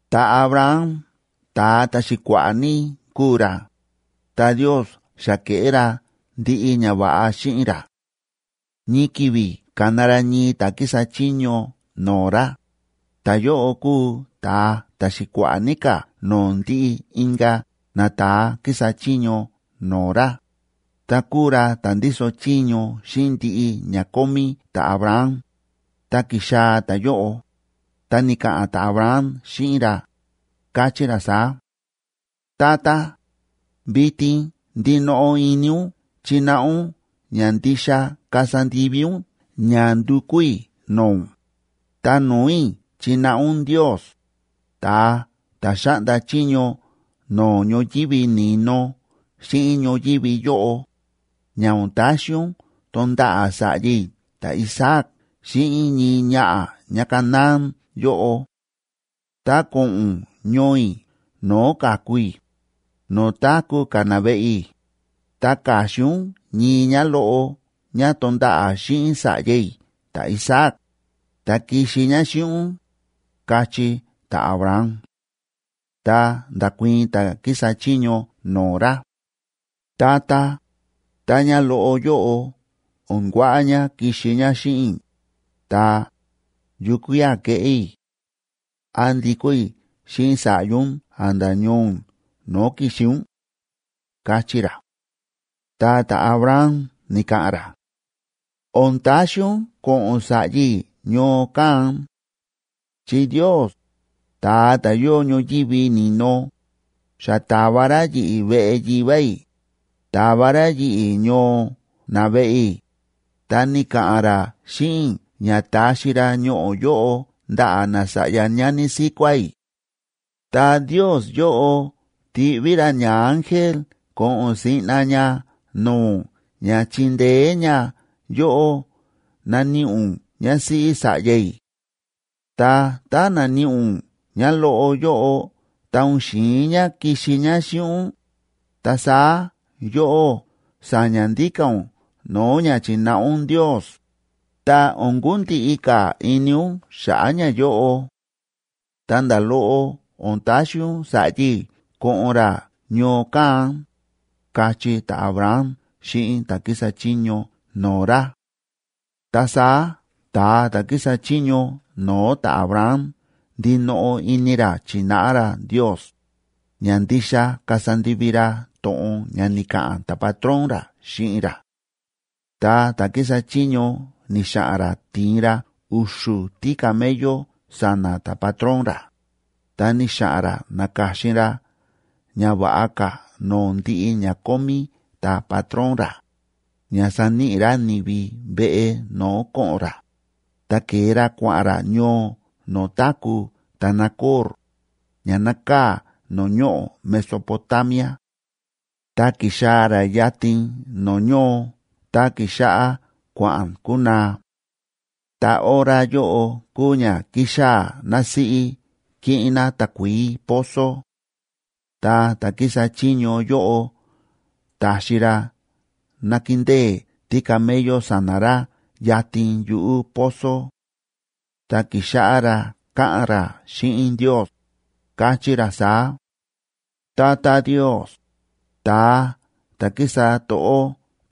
Ta̱Abraham ta̱a ta̱xi̱kua̱ꞌa̱ ní kúu ra, ta Ndiosa xa ke̱ꞌé ra ndiꞌi ñava̱ꞌa xíꞌin ra. Ñii ki̱vi̱ ka̱na ra ñii ta̱ kísa chiño no̱o̱ ra, ta̱yóꞌo kúu ta̱a ta̱xi̱kua̱ꞌa̱ ní ka̱ no̱o̱ ndiꞌi inka̱ nata̱a kísa chiño no̱o̱ ra, ta kúu ra ta̱ ndíso chiño xíꞌin ndiꞌi ña kómí ta̱Abraham, ta ki̱xaa̱ ta̱yóꞌo, ta ni̱ka̱ꞌa̱n ta̱Abraham xíꞌin ra, káchí ra saá: ―Tata, vitin ndinoꞌo ini ún chináꞌa ún ña ndixa kasa ndivi ún ña ndukú i̱ no̱o̱ ún, ta no̱o̱ i̱ chináꞌa ún Ndios, ta̱a ta̱ xáꞌnda chiño no̱o̱ ñoyívi ni̱no xíꞌin ñoyívi yóꞌo, ña o̱n taxi ún tonda̱ꞌa̱ sa̱ꞌya i̱ ta̱Isaac xíꞌin ñii ñaꞌa̱ ñáCanaán yóꞌo. Ta ko̱ꞌo̱n ún ñoo i̱ no̱o̱ ka̱ku i̱, no̱o̱ táku̱ ka̱ naveꞌe i̱, ta ka̱xin ún ñii ñáloꞌo ñá tonda̱ꞌa̱ xíꞌin sa̱ꞌya i̱ ta̱Isaac, ta kixi ñá xíꞌin ún ―káchí ta̱Abraham. Ta nda̱kuii̱n ta̱ kísa chiño no̱o̱ ra: ―Tata, tá ñáloꞌo yóꞌo o̱n kuaꞌa ñá kixi ñá xíꞌin i̱, ta, ¿yukía̱ keꞌé i̱? ¿Án ndikó i̱ xíꞌin sa̱ꞌya ún a̱nda̱ ñoo ún no̱o̱ ki̱xi ún? ―káchí ra. Ta ta̱Abraham ni̱ka̱ꞌa̱n ra: ―O̱n taxi ún ko̱ꞌo̱n sa̱ꞌya i̱ ñoo kán. Chi Ndios, ta̱a ta̱ yóo ñoyívi ni̱no, xa ta̱va ra yi̱ꞌi̱ veꞌe yivá i̱, ta̱va ra yi̱ꞌi̱ ñoo naveꞌe i̱, ta ni̱ka̱ꞌa̱n ra xíꞌin i̱ ña taxi ra ñoꞌo̱ yóꞌo ndaꞌa̱ nasa̱ꞌya ñani síkuá i̱. Ta Ndios yóꞌo tiꞌví ra ñaángel ko̱ꞌo̱n siꞌna ña no̱o̱ ún ña chindeé ña yóꞌó naníꞌi ún ñásíꞌí sa̱ꞌya i̱. Ta tá naníꞌi ún ñáloꞌo yóꞌo ta o̱n xi̱in ñá kixi ñá xíꞌin ún, ta saá yóꞌó sa̱ña̱ ndíka̱ ún no̱o̱ ña chi̱náꞌa ún Ndios, ta o̱n kundiꞌi ka̱ ini ún xa̱ꞌa̱ ñayóꞌo. Ta nda̱ loꞌo o̱n taxi ún sa̱ꞌya i̱ ko̱ꞌo̱n ra ñoo kán ―káchí ta̱Abraham xíꞌin ta̱ kísa chiño no̱o̱ ra. Ta saá ta̱a ta̱ kísa chiño no̱o̱ ta̱Abraham ndinoꞌo ini ra chi̱náꞌa ra Ndios, ña ndixa kasa ndivi ra to̱ꞌon ña ni̱ka̱ꞌa̱n ta̱patrón ra xíꞌin ra. Ta ta̱ kísa chiño ni̱xa̱ꞌa̱n ra ti̱in ra u̱xu̱ tícamello sa̱na̱ ta̱patrón ra, ta ni̱xa̱ꞌa̱n ra na̱ka̱xin ra ña va̱ꞌa ka̱ no̱o̱ ndiꞌi ña kómí ta̱patrón ra, ña saníꞌi ra ni̱vi veꞌe no̱o̱ ko̱ꞌo̱n ra, ta ke̱e ra kua̱ꞌa̱n ra ñoo no̱o̱ táku̱ ta̱Nacor, ña nákaa̱ no̱o̱ ñoꞌo̱ Mesopotamia. Ta ki̱xaa̱ ra yatin no̱o̱ ñoo ta ki̱xáꞌá kua̱ꞌa̱n kunaa. Ta hora yóꞌo kúu ña kíxaa̱ násíꞌí kiꞌin ná takuií pozo. Ta ta̱ kísa chiño yóꞌo ta̱xi ra nakindée tícamello sa̱na̱ ra yatin yuꞌu̱ pozo. Ta ki̱xáꞌá ra káꞌa̱n ra xíꞌin Ndios, káchí ra saá: ―Tata Ndios, ta̱a ta̱ kísa to̱ꞌó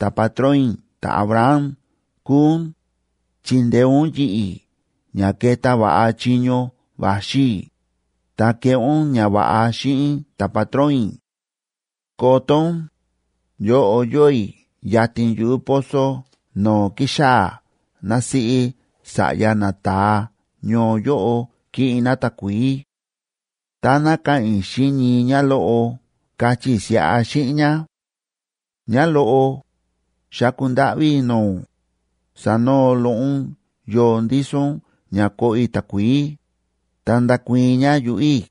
ta̱patrón i̱ ta̱Abraham kúu ún, chindeé ún yi̱ꞌi̱ ña keta va̱ꞌa chiño va̱xi i̱, ta keꞌé ún ñava̱ꞌa xíꞌin ta̱patrón i̱. Koto ún, yóꞌo yóo i̱ yatin yuꞌu̱ pozo no̱o̱ kíxaa̱ násíꞌí sa̱ꞌya nata̱a ñoo yóꞌo kiꞌin ná takuií. Táná ka̱ꞌa̱n i̱ xíꞌin ñii ñáloꞌo kachí i̱ siꞌa xíꞌin ñá: “Ñáloꞌo, xáku ndáꞌví i̱ no̱o̱ ún, sanoo loꞌo ún yoo ndíso ún ña koꞌo i̱ takuií”, ta ndakuii̱n ñá yuꞌu̱ i̱,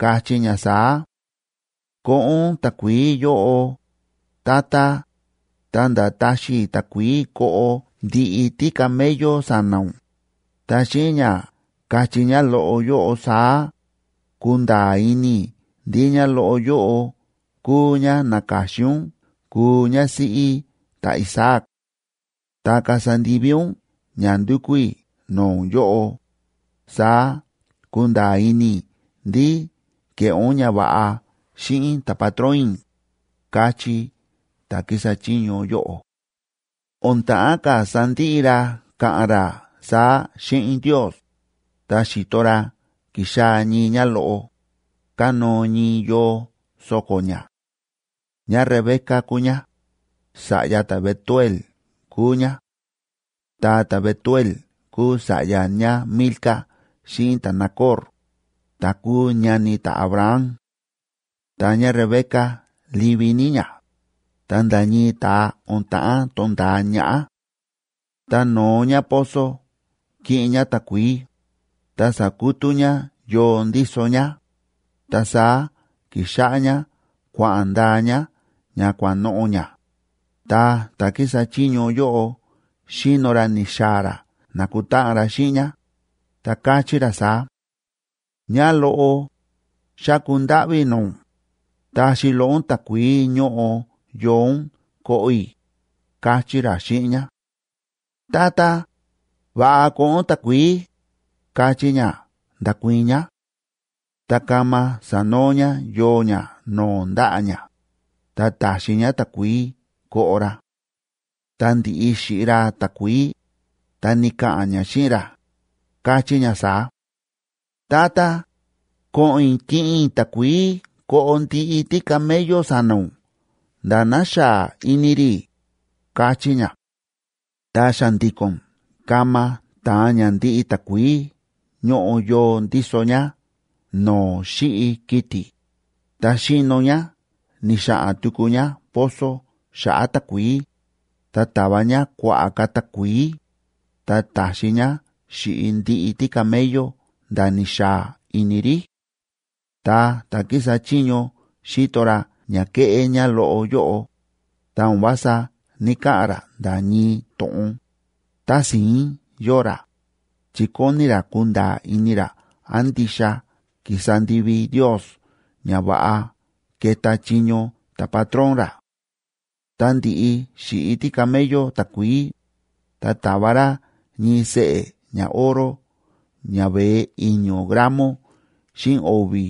kachí ñá saá: “Koꞌo ún takuií yóꞌo, tata, ta̱nda̱ taxi i̱ takuií koꞌo ndiꞌi tícamello sa̱na̱ ún”, ta xíꞌin ña kachí ñáloꞌo yóꞌo saá, kunda̱a̱ ini i̱ ndí ñáloꞌo yóꞌo kúu ñá na̱ka̱xin ún kuu ñásíꞌí ta̱Isaac. Tá kasa ndivi ún ña ndúkú i̱ no̱o̱ ún yóꞌo, saá kunda̱a̱ ini i̱ ndí ke̱ꞌé ún ñava̱ꞌa xíꞌin ta̱patrón i̱ ―káchí ta̱ kísa chiño yóꞌo. O̱n ta̱ꞌán ka̱ sandiꞌi ra káꞌa̱n ra saá xíꞌin Ndios, ta xi̱to ra ki̱xaa̱ ñii ñáloꞌo, kánóo ñii yoo so̱ko̱ ñá. ÑáRebeca kúu ñá, sa̱ꞌya ta̱Betuel kúu ñá. Ta ta̱Betuel kúu sa̱ꞌya ñáMilca xíꞌin ta̱Nacor, ta̱ kúu ñani ta̱Abraham. Ta ñáRebeca livi ní ñá, ta nda̱ ñii ta̱a o̱n ta̱ꞌán to̱nda̱a ñaꞌá. Ta no̱o ñá pozo kiꞌin ñá takuií, ta sa̱kutú ñá yoo ndíso ñá, ta saá ki̱xáꞌá ñá kua̱ꞌa̱n ndaa ñá ña kua̱ꞌa̱n noꞌo̱ ñá, ta ta̱ kísa chiño yóꞌo xíno ra ni̱xaa̱ ra na̱kutáꞌan ra xíꞌin ñá, ta káchí ra saá: ―Ñáloꞌo, xáku ndáꞌví i̱ no̱o̱ ún, taxi loꞌo ún takuií ñóꞌo yoo ún koꞌo i̱ ―káchí ra xíꞌin ñá. ―Tata, va̱ꞌa koꞌo ún takuií ―káchí ñá, nda̱kuii̱n ñá. Ta kama sa̱noo ñá yoo ñá no̱o̱ ndaꞌa̱ ñá, ta ta̱xi ñá takuií koꞌo ra. Ta ndi̱ꞌi xi̱ꞌi ra takuií, ta ni̱ka̱ꞌa̱n ñá xíꞌin ra, káchí ñá saá: ―Tata, ko̱ꞌo̱n i̱ kiꞌin i̱ takuií koꞌo ndiꞌi tícamello sa̱na̱ ún nda̱ ná xaa ini rí ―káchí ñá. Ta xa̱ndi̱ko̱n kama ta̱an ñá ndiꞌi takuií ñóꞌo yoo ndíso ñá no̱o̱ xíꞌi kiti̱, ta xi̱no ñá ni̱xa̱ꞌa̱n tuku ñá pozo xa̱ꞌa̱ takuií, ta ta̱va ñá kua̱ꞌa̱ ka̱ takuií, ta ta̱xi ñá xíꞌi ndiꞌi tícamello nda̱ ni̱xaa ini rí. Ta ta̱ kísa chiño xíto ra ña ke̱ꞌé ñáloꞌo yóꞌo, ta o̱n vása ní‑kaꞌa̱n ra nda̱ ñii to̱ꞌon, tási̱ín yóo ra, chi kóni ra kunda̱a̱ ini ra án ndixa ki̱sa ndivi Ndios ña va̱ꞌa ke̱ta chiño ta̱patrón ra. Ta ndi̱ꞌi xi̱ꞌi tícamello takuií, ta ta̱va ra ñii seꞌe̱ ñaoro ña veé i̱ño̱ gramob xíꞌin o̱vi̱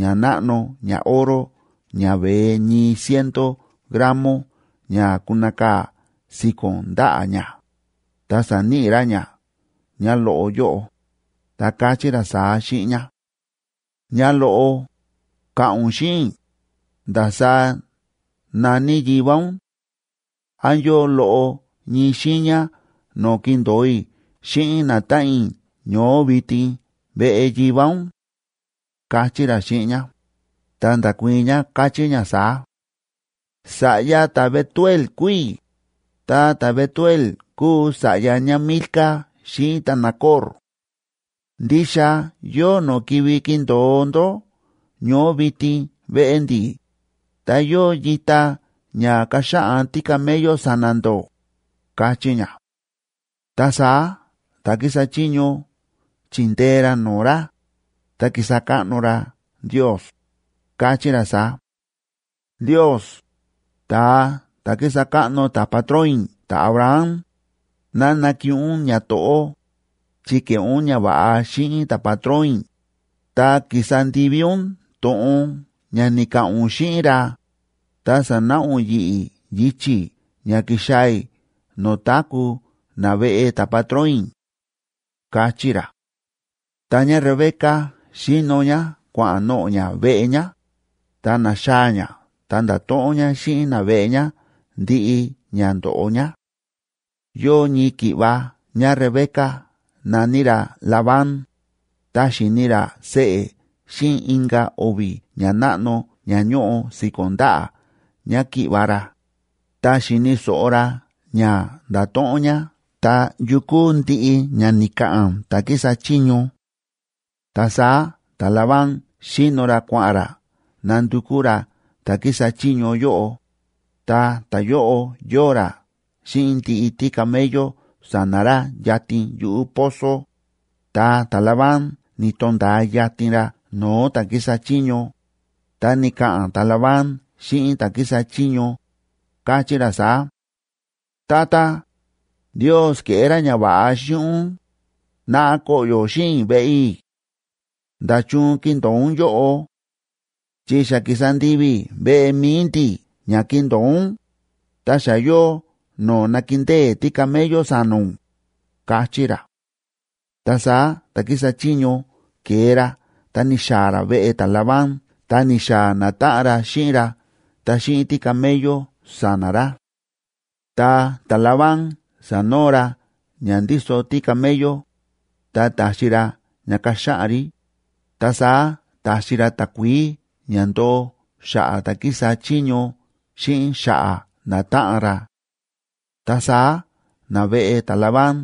ñanáꞌno ñaoro ña veé ñii ciento gramo ña kunakaa̱ si̱ko̱n ndaꞌa̱ ñá, ta sa̱níꞌi ra ña ñáloꞌo yóꞌo, ta káchí ra saá xíꞌin ñá: ―Ñáloꞌo, ka̱ꞌa̱n ún xíꞌin i̱, ¿ndasaá na̱ní yivá ún? ¿Án yóo loꞌo ñii xiiña no̱o̱ kindo̱o i̱ xíꞌin natáꞌan i̱ ñoó vitin veꞌe yivá ún? ―káchí ra xíꞌin ñá. Ta nda̱kuii̱n ñá, káchí ñá saá: ―Sa̱ꞌya ta̱Betuel kúu i̱, ta ta̱Betuel kúu sa̱ꞌya ñáMilca xíꞌin ta̱Nacor. Ndixa yóo no̱o̱ kivi kindo̱o ndó ñoó vitin veꞌe ndi̱, ta yóo yita ña kaxaꞌan tícamello sa̱na̱ ndó ―káchí ñá. Ta saá ta̱ kísa chiño chi̱ndee ra no̱o̱ ra, ta ki̱sa káꞌno ra Ndios, káchí ra saá: ―Ndios, ta̱a ta̱ kísa káꞌno ta̱patrón i̱ ta̱Abraham, ¡ná nakiꞌin ún ñato̱ꞌó, chi ke̱ꞌé ún ñava̱ꞌa xíꞌin ta̱patrón i̱, ta ki̱sa ndivi ún to̱ꞌon ña ni̱ka̱ꞌa̱n ún xíꞌin ra, ta sa̱náꞌa ún yi̱ꞌi̱ yichi̱ ña ki̱xaa̱ i̱ no̱o̱ táku̱ naveꞌe ta̱patrón i̱! ―káchí ra. Ta ñáRebeca xi̱no ñá kua̱ꞌa̱n noꞌo̱ ñá veꞌe ñá, ta na̱xaa̱ ñá ta nda̱to̱ꞌon ñá xíꞌin naveꞌe ñá ndiꞌi ña ndo̱ꞌo ñá. Yóo ñii ki̱ꞌva̱ ñáRebeca na̱ní ra Labán, ta xi̱ni ra seꞌe̱ xíꞌin inka̱ o̱vi̱ ñanáꞌno ña ñóꞌo si̱ko̱n ndaꞌa̱ ñáki̱ꞌva̱ ra, ta xi̱ni̱ so̱ꞌo ra ña nda̱to̱ꞌon ñá ta yu kúu ndiꞌi ña ni̱ka̱ꞌa̱n ta̱ kísa chiño. Ta saá ta̱Labán xi̱no ra kua̱ꞌa̱n ra nandukú ra ta̱ kísa chiño yóꞌo, ta ta̱yóꞌo yóo ra xíꞌin ndiꞌi tícamello sa̱na̱ ra yatin yuꞌu̱ pozo, ta ta̱Labán ni̱to̱nda̱a yatin ra no̱o̱ ta̱ kísa chiño, ta ni̱ka̱ꞌa̱n ta̱Labán xíꞌin ta̱ kísa chiño, káchí ra saá: ―Tata, Ndios ke̱ꞌé ra ñava̱ꞌa xíꞌin ún, naꞌa koꞌyo̱ xíꞌin i̱ veꞌe i̱. ¿Nda̱chun kíndo̱o ún yóꞌo?, chi xa ki̱sa ndivi i̱ veꞌe mi̱i ndi̱ ña kindo̱o ún, ta xa yóo no̱o̱ nakindée tícamello sa̱na̱ ún ―káchí ra. Ta saá ta̱ kísa chiño ke̱e ra ta ni̱xaa̱ ra veꞌe ta̱Labán ta ni̱xaa̱ natáꞌan ra xíꞌin ra ta xíꞌin tícamello sa̱na̱ ra. Ta ta̱Labán sa̱noo ra ña ndíso tícamello, ta ta̱xi ra ña kaxaꞌan rí, ta saá ta̱xi ra takuií ña ndoo xa̱ꞌa̱ ta̱ kísa chiño xíꞌin xa̱ꞌa̱ natáꞌan ra. Ta saá naveꞌe ta̱Labán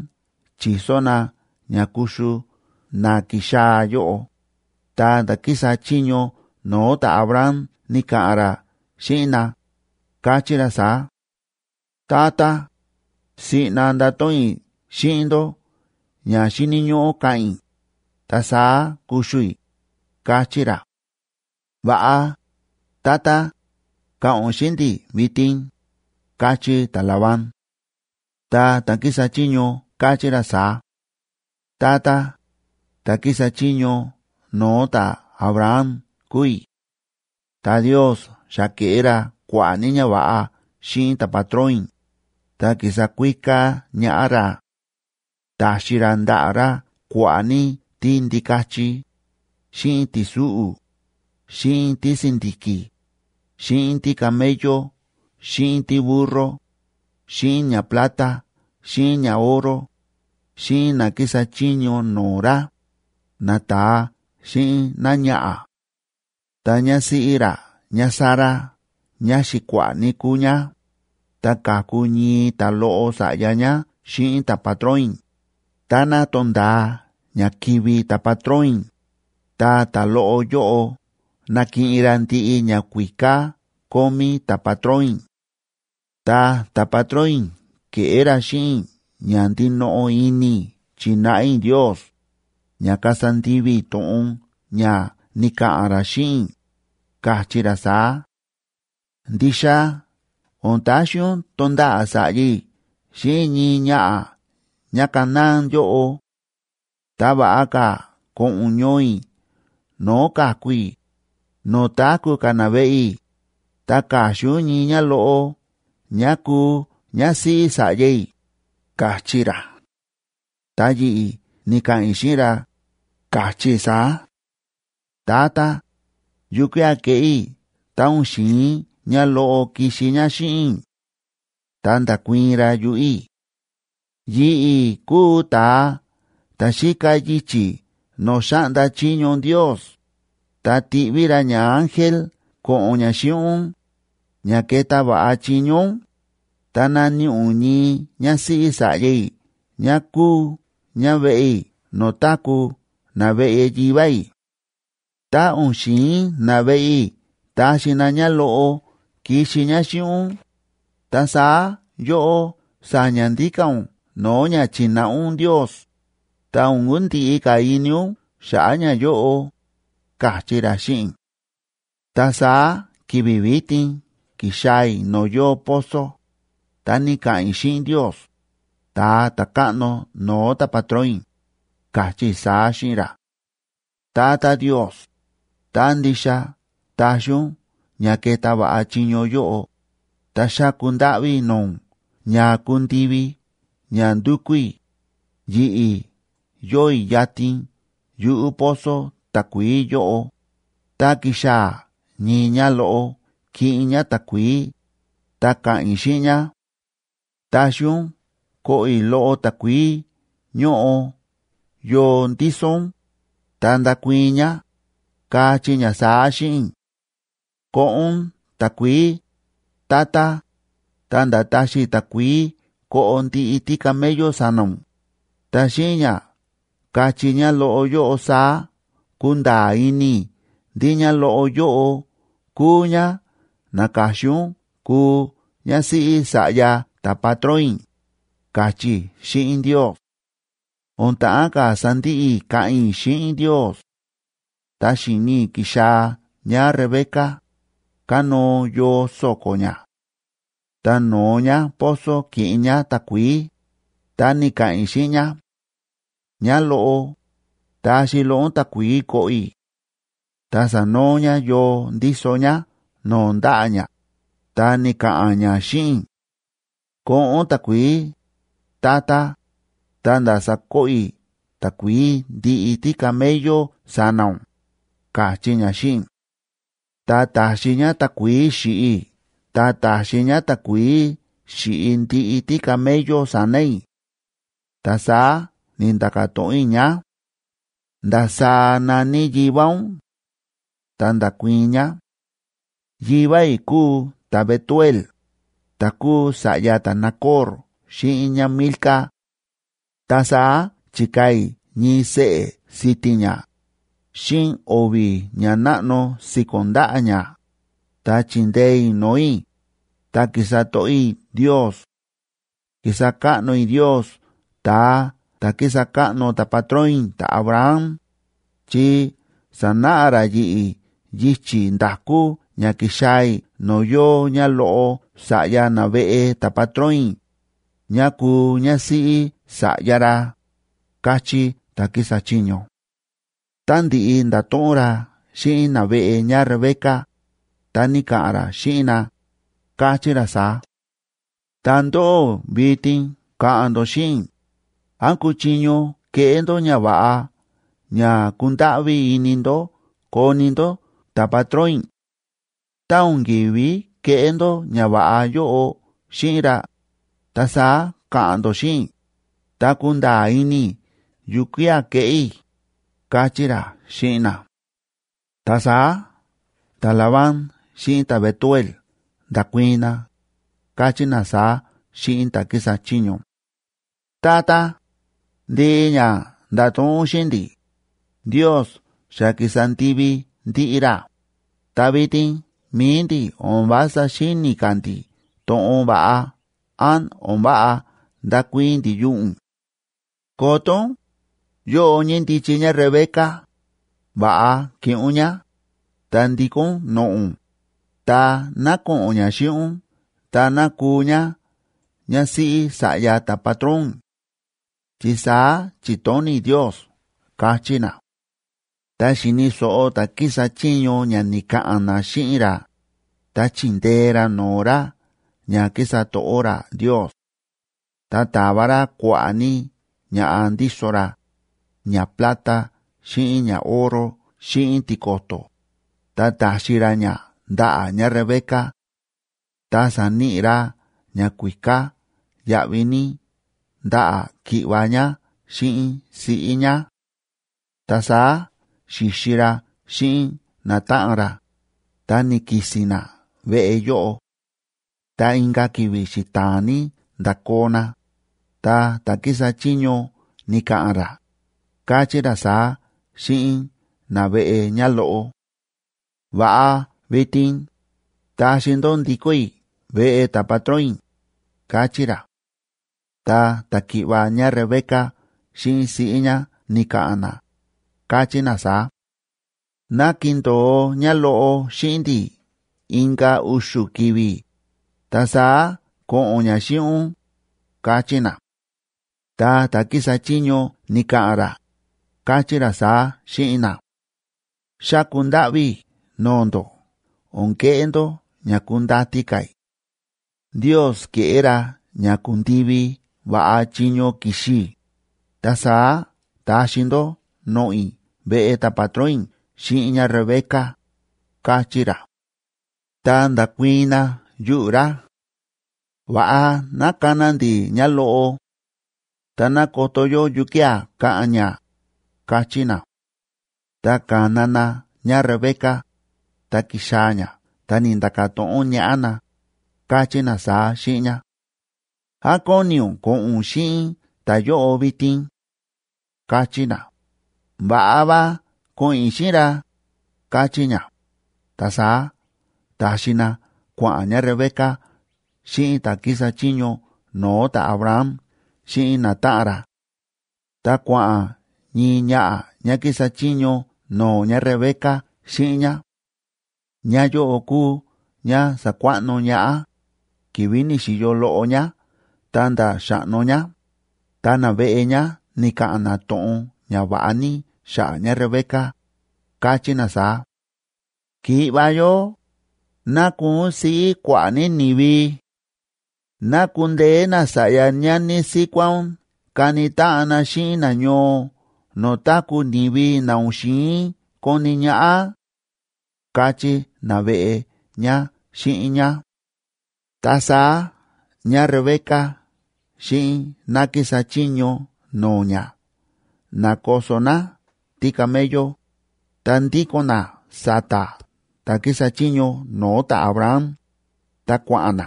chi̱so na ña kuxu na ki̱xaa̱ yóꞌo, ta ta̱ kísa chiño no̱o̱ ta̱Abraham ni̱ka̱ꞌa̱n ra xíꞌin na, káchí ra saá: ―Tata, siꞌna ndato̱ꞌon i̱ xíꞌin ndó ña xíni̱ ñóꞌó ka̱ꞌa̱n i̱, ta saá kuxu i̱ ―káchí ra. ―Va̱ꞌa, tata, ka̱ꞌa̱n ún xíꞌin ndi̱ vitin ―káchí ta̱Labán. Ta ta̱ kísa chiño káchí ra saá: ―Tata, ta̱ kísa chiño no̱o̱ ta̱Abraham kúu i̱. Ta Ndios xa ke̱ꞌé ra kua̱ꞌa̱ ní ñava̱ꞌa xíꞌin ta̱patrón i̱, ta ki̱sa kuíká ñaꞌá ra. Ta̱xi ra ndaꞌa̱ ra kua̱ꞌa̱ ní tíndikachi, xíꞌin ti̱súꞌu̱, xíꞌin tísi̱ndi̱ki̱, xíꞌin tícamello xíꞌin tíburro, xíꞌin ñaplata xíꞌin ñaoro, xíꞌin na kísa chiño no̱o̱ ra, nata̱a xíꞌin náñaꞌa̱. Ta ñásíꞌí ra ñáSara ñáxi̱kua̱ꞌa̱ ní kúu ñá, ta ka̱ku ñii ta̱loꞌo sa̱ꞌya ñá xíꞌin ta̱patrón i̱, táná to̱nda̱a ña kivi̱ ta̱patrón i̱, ta ta̱loꞌo yóꞌo nakiꞌin ra ndiꞌi ñakuíká kómí ta̱patrón i̱. Ta ta̱patrón i̱ ke̱ꞌé ra xíꞌin i̱ ña ndinoꞌo ini i̱ chi̱náꞌa i̱ Ndios, ña kasa ndivi i̱ to̱ꞌon ña ni̱ka̱ꞌa̱n ra xíꞌin i̱, ka̱chí ra saá: “Ndixa o̱n taxi ún tonda̱ꞌa̱ sa̱ꞌya i̱ xíꞌin ñii ñaꞌa̱ ñáCanaán yóꞌo. Ta va̱ꞌa ka̱ ko̱ꞌo̱n ún ñoo i̱ no̱o̱ ka̱ku i̱, no̱o̱ táku̱ ka̱ naveꞌe i̱, ta ka̱xin ún ñii ñáloꞌo ñá kuu ñásíꞌí sa̱ꞌya i̱”, ka̱chí ra. Ta yi̱ꞌi̱ ni̱ka̱ꞌa̱n i̱ xíꞌin ra, ka̱chí i̱ saá: “Tata, ¿yukía̱ keꞌé i̱ tá o̱n xi̱in ñáloꞌo kixi ñá xíꞌin i̱?” Ta nda̱kuii̱n ra yuꞌu̱ i̱: “Yi̱ꞌi̱ kúu ta̱a ta̱ xíka yichi̱ no̱o̱ xáꞌnda chiño Ndios, ta tiꞌví ra ñaángel ko̱ꞌo̱n ña xíꞌin ún, ña keta va̱ꞌa chiño ún, ta naníꞌi ún ñii ñásíꞌí sa̱ꞌya i̱ ñá kúu ñá veꞌe i̱ no̱o̱ táku̱ naveꞌe yivá i̱. Tá o̱n xi̱in naveꞌe i̱ taxi na ñáloꞌo kixi ñá xíꞌin ún, ta saá yóꞌó sa̱ña̱ ndíka̱ ún no̱o̱ ña chi̱náꞌa ún Ndios, ta o̱n kundiꞌi ka̱ ini ún xa̱ꞌa̱ ñayóꞌo”, ka̱chí ra xíꞌin i̱. ’Ta saá ki̱vi̱ vitin ki̱xaa̱ i̱ no̱o̱ yóo pozo, ta ni̱ka̱ꞌa̱n i̱ xíꞌin Ndios, ta̱a ta̱káꞌno no̱o̱ ta̱patrón i̱, ka̱chí i̱ saá xíꞌin ra: “Tata Ndios, tá ndixa taxi ún ña keta va̱ꞌa chiño yóꞌo, ta xáku ndáꞌví i̱ no̱o̱ ún ña kundivi ña ndúkú i̱. Yi̱ꞌi̱ yóo i̱ yatin yuꞌu̱ pozo takuií yóꞌo, tá kixaa̱ ñii ñáloꞌo kiꞌin ñá takuií, ta ka̱ꞌa̱n i̱ xíꞌin ñá: Taxi ún koꞌo i̱ loꞌo takuií ñóꞌo yoo ndíso ún, ta ndakuii̱n ñá, kachí ñá saá xíꞌin i̱: Koꞌo ún takuií, tata, ta̱nda̱ taxi i̱ takuií koꞌo ndiꞌi tícamello sa̱na̱ ún, ta xíꞌin ña kachí ñáloꞌo yóꞌo saá kunda̱a̱ ini i̱ ndí ñáloꞌo yóꞌo kúu ñá na̱ka̱xin ún kuu ñásíꞌí sa̱ꞌya ta̱patrón i̱”, ka̱chí i̱ xíꞌin Ndios. O̱n ta̱ꞌán ka̱ sandiꞌi i̱ káꞌa̱n i̱ xíꞌin Ndios, ta xi̱ni i̱ ki̱xaa̱ ñáRebeca, kánóo yoo so̱ko̱ ñá. Ta no̱o ñá pozo kiꞌin ñá takuií, ta ni̱ka̱ꞌa̱n i̱ xíꞌin ñá: “Ñáloꞌo, taxi loꞌo ún takuií koꞌo i̱.” Ta sa̱noo ñá yoo ndíso ñá no̱o̱ ndaꞌa̱ ñá, ta ni̱ka̱ꞌa̱n ñá xíꞌin i̱: “Koꞌo ún takuií, tata, ta̱nda̱ sakoꞌo i̱ takuií ndiꞌi tícamello sa̱na̱ ún”, ka̱chí ñá xíꞌin i̱. Ta ta̱xi ñá takuií xi̱ꞌi i̱ ta ta̱xi ñá takuií xi̱ꞌi ndiꞌi tícamello sa̱na̱ i̱. Ta saá ni̱nda̱ka̱ to̱ꞌon i̱ ñá: “¿Ndasaá na̱ní yivá ún?” Ta nda̱kuii̱n ñá: “Yivá i̱ kúu ta̱Betuel, ta̱ kúu sa̱ꞌya ta̱Nacor xíꞌin ñáMilca.” Ta saá chi̱kaa̱ i̱ ñii seꞌe̱ si̱ti̱n ñá xíꞌin o̱vi̱ ñanáꞌno si̱ko̱n ndaꞌa̱ ñá, ta chi̱ndee i̱ no̱o̱ i̱, ta ki̱sa to̱ꞌó i̱ Ndios. Ki̱sa káꞌno i̱ Ndios ta̱a ta̱ kísa káꞌno ta̱patrón i̱ ta̱Abraham, chi sa̱náꞌa ra yi̱ꞌi̱ yichi̱ nda̱kú ña ki̱xaa̱ i̱ no̱o̱ yóo ñáloꞌo sa̱ꞌya naveꞌe ta̱patrón i̱ ñá kuu ñásíꞌí sa̱ꞌya ra ―káchí ta̱ kísa chiño. Tá ndi̱ꞌi nda̱to̱ꞌon ra xíꞌin naveꞌe ñáRebeca, ta ni̱ka̱ꞌa̱n ra xíꞌin na, káchí ra saá: ―Ta ndóꞌó, vitin ka̱ꞌa̱n ndó xíꞌin i̱, ¿án kuchiño keꞌé ndó ñava̱ꞌa ña kundáꞌví ini ndó koni ndó ta̱patrón i̱? Tá o̱n kívi keꞌé ndó ñava̱ꞌa yóꞌo xíꞌin ra, ta saá ka̱ꞌa̱n ndó xíꞌin i̱, ta kunda̱a̱ ini i̱ yukía̱ keꞌé i̱ ―káchí ra xíꞌin na. Ta saá ta̱Labán xíꞌin ta̱Betuel nda̱kuii̱n na, káchí na saá xíꞌin ta̱ kísa chiño: ―Tata, ndiꞌi ña nda̱to̱ꞌon ún xíꞌin ndi̱, Ndios xa ki̱sa ndivi ndiꞌi ra, ta vitin mi̱i ndi̱ o̱n vása xíni̱ ka̱ ndi̱ to̱ꞌon va̱ꞌa án o̱n váꞌa ndakuii̱n ndi̱ yuꞌu̱ ún. Koto ún, yóꞌo ñíndichi ñáRebeca, va̱ꞌa kiꞌin ún ñá, ta ndikó ún noꞌo̱ ún, ta ná ko̱ꞌo̱n ñá xíꞌin ún ta ná kuu ñá ñásíꞌí sa̱ꞌya ta̱patrón ún, chi saá chi̱tóni̱ Ndios ―káchí na. Tá xi̱ni̱ so̱ꞌo ta̱ kísa chiño ña ni̱ka̱ꞌa̱n na xíꞌin ra, ta chi̱ndee ra no̱o̱ ra ña kísa to̱ꞌó ra Ndios. Ta ta̱va ra kua̱ꞌa̱ ní ña̱ꞌa ndíso ra, ñaplata xíꞌin ñaoro xíꞌin tiko̱to̱, ta ta̱xi ra ña ndaꞌa̱ ñáRebeca. Ta sa̱níꞌi ra ñakuíká yáꞌví ní ndaꞌa̱ ki̱ꞌva̱ ñá xíꞌin siꞌí ñá. Ta saá xi̱xi ra xíꞌin natáꞌan ra, ta ni̱ki̱si̱n na veꞌe yóꞌo. Ta inka̱ ki̱vi̱ xita̱a̱n ní nda̱koo na, ta ta̱ kísa chiño ni̱ka̱ꞌa̱n ra, káchí ra saá xíꞌin naveꞌe ñáloꞌo: ―Va̱ꞌa vitin, taxi ndó ndikó i̱ veꞌe ta̱patrón i̱ ―káchí ra. Ta ta̱ki̱ꞌva̱ ñáRebeca xíꞌin siꞌí ñá ni̱ka̱ꞌa̱n na, káchí na saá: ―Ná kindo̱o ñáloꞌo xíꞌin ndi̱ inka̱ u̱xu̱ ki̱vi̱, ta saá ko̱ꞌo̱n ñá xíꞌin ún ―káchí na. Ta ta̱ kísa chiño ni̱ka̱ꞌa̱n ra, káchí ra saá xíꞌin na: ―Xáku ndáꞌví i̱ no̱o̱ ndó o̱n keꞌé ndó ña kundati ka̱ i̱. Ndios ke̱ꞌé ra ña ku̱ndivi va̱ꞌa chiño ki̱xi i̱, ta saá taxi ndó noꞌo̱ i̱ veꞌe ta̱patrón i̱ xíꞌin ñáRebeca ―káchí ra. Ta nda̱kuii̱n na yuꞌu̱ ra: ―Va̱ꞌa ná kana ndi̱ ñáloꞌo, ta ná koto yó yukía̱ ka̱ꞌa̱n ñá ―káchí na. Ta ka̱na na ñáRebeca, ta ki̱xaa̱ ñá ta ni̱nda̱ka̱ to̱ꞌon ñaꞌá na, káchí na saá xíꞌin ñá: ―¿Án kóni ún ko̱ꞌo̱n ún xíꞌin ta̱yóꞌo vitin? ―káchí na. ―Va̱ꞌa va, ko̱ꞌo̱n i̱ xíꞌin ra ―káchí ñá. Ta saá ta̱xi na kua̱ꞌa̱n ñáRebeca xíꞌin ta̱ kísa chiño no̱o̱ ta̱Abraham xíꞌin natáꞌan ra. Ta kua̱ꞌa̱n ñii ñaꞌa̱ ñá kísa chiño no̱o̱ ñáRebeca xíꞌin ñá. Ñáyóꞌo kúu ñá sa̱kuaꞌno ñaꞌá, ki̱vi̱ ni̱xi̱yo loꞌo ñá ta̱nda̱ xa̱ꞌno ñá. Ta naveꞌe ñá ni̱ka̱ꞌa̱n na to̱ꞌon ñava̱ꞌa ní xa̱ꞌa̱ ñáRebeca, káchí na saá: Ki̱ꞌva̱ yó, ¡ná kuu ún siꞌí kua̱ꞌa̱ ní ni̱vi! ¡Ná kundeé nasa̱ꞌya ñani síkuá ún kani táꞌan na xíꞌin nañoo no̱o̱ táku̱ ni̱vi na o̱n xi̱in koni ñaꞌá!, káchí naveꞌe ñá xíꞌin ñá. Ta saá ñáRebeca xíꞌin ná kísa chiño no̱o̱ ñá na̱koso ná tícamello, ta ndíko̱n ná sa̱ta̱ ta̱ kísa chiño no̱o̱ ta̱Abraham, ta kua̱ꞌa̱n na.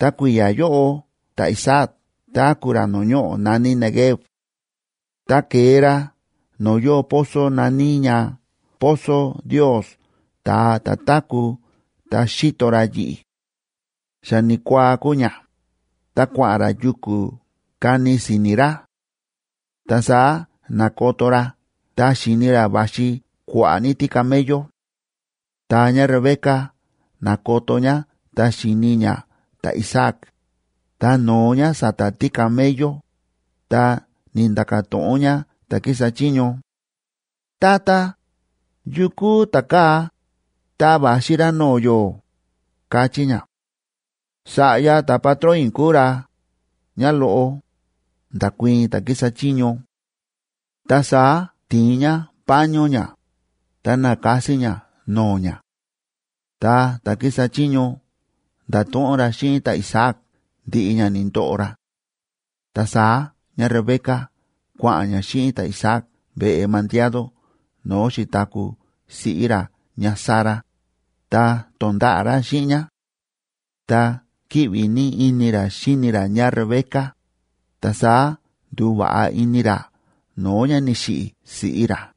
Ta kui̱ya̱ yóꞌo ta̱Isaac táku̱ ra no̱o̱ ñoꞌo̱ na̱ní Neguev. Ta ke̱e ra no̱o̱ yóo pozo na̱ní ña Pozo Ndios, ta̱a ta̱ táku̱ ta xíto ra yi̱ꞌi̱. Xa ni̱kuaa kúu ña, ta kua̱ꞌa̱n ra yuku̱ kani si̱ni̱ ra. Ta saá na̱koto ra ta xi̱ni ra va̱xi kua̱ꞌa̱ ní tícamello. Ta ñáRebeca na̱koto ñá ta xi̱ni ñá ta̱Isaac, ta no̱o ñá sa̱ta̱ tícamello, ta ni̱nda̱ka̱ to̱ꞌon ñá ta̱ kísa chiño: ―Tata, ¿yu kúu ta̱kaa̱, ta va̱xi ra no̱o̱ yó? ―káchí ñá. ―Sa̱ꞌya ta̱patrón i̱ kúu ra, ñáloꞌo ―nda̱kuii̱n ta̱ kísa chiño. Ta saá ti̱in ñá paño ñá, ta na̱kasi ñá no̱o̱ ñá. Ta ta̱ kísa chiño nda̱to̱ꞌon ra xíꞌin ta̱Isaac ndiꞌi ña ni̱ndoꞌo ra. Ta saá ñáRebeca kua̱ꞌa̱n ñá xíꞌin ta̱Isaac veꞌe mandiado no̱o̱ xi̱taku̱ siꞌí ra ñáSara, ta to̱nda̱ꞌa̱ ra xíꞌin ñá. Ta kíꞌvi ní ini ra xíni ra ñáRebeca, ta saá ndu̱va̱ꞌa ini ra no̱o̱ ña ni̱xiꞌi̱ siꞌí ra.